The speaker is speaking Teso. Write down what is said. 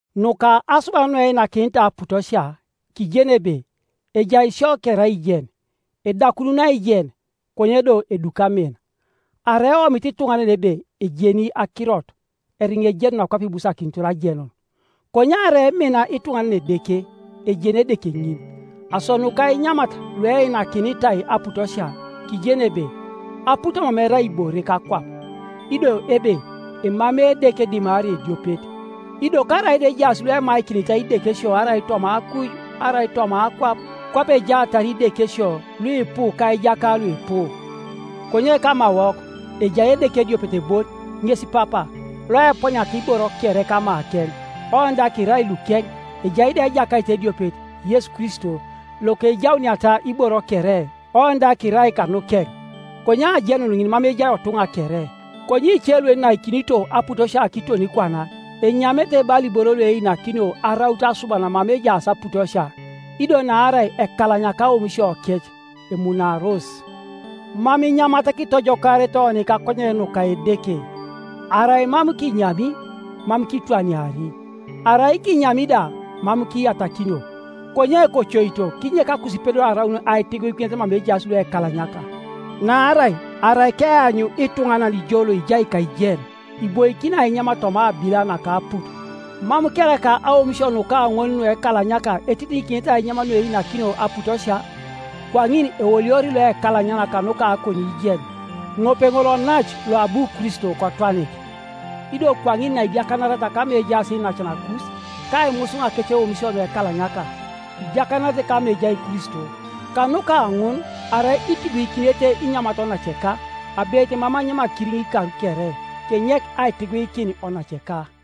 Nuka asuban nueinakinitai aputosia; kijeni ebe, “Ejai sio kere aijen.” Edakunun aijen, konye do eduki amin. Arai eomit ituŋanan ebe ejeni akirot, eriŋa ejenuna kwape ibusakinitor ajenun. Konye arai emina ituŋanan Edeke, ejeni Edeke ŋin. Aso nuka inyamat lueinakinitai aputosia, kijeni ebe, “Aput mam erai ibore kakwap,” ido ebe, “Emamei Edeke dimarai ediopet.” Ido karaida ejaas luemaikinitai idekesio arai toma akuj arai toma akwap, kwape ejaatar “idekesio” luipu ka “ijaka” luipu, konye kamawok ejai Edeke ediopet bon, ŋes Papa, loeponiata iboro kere kamakeŋ, oni da kirai lukeŋ, ejai da Ejakait ediopet, Yesu Kristo, lokejauniata iboro kere, oni da kirai kanukeŋ. Konye ajenun ŋin mam ejai otuŋa kere. Konye ice luenaikinito aputosia kiton kwana, enyamete bala iboro lueinakinio araut asuban mama ejaas aputosia; ido naarai ekalanyaka aomisiokec, emunaaros. Mam inyamat kitojokaarete oni kakonyen nuka Edeke, Arai mam kinyami, mam kitwaniari, arai kinyami da mam kiyatakinio. Konye kocoito kinyek akusipedor araun aitiguikinet mama ejaas luekalanyaka. Naarai arai keanyu ituŋanan jo loijai kaijen, iboikin ainyam toma abila naka aput, mam kereka aomisio nuka ŋol nuekalanyaka etitiŋikinete ainyam lueinakinio aputosia? Kwaŋin eoliori loekalanyana kanuka akoniijen, ŋope ŋol onace loabu Kristo kotwanik. Ido kwaŋin naidiakanariata kama ejaas iinacanakus, ka aimusuŋ akeceomisio nuekalanyaka, idiakanaretc kama ejai Kristo. Kanuka ŋun arai itiguikinete inyamat onaceka, abeit mam anyami akiriŋ ikar kere, kenyek aitiguikin onaceka.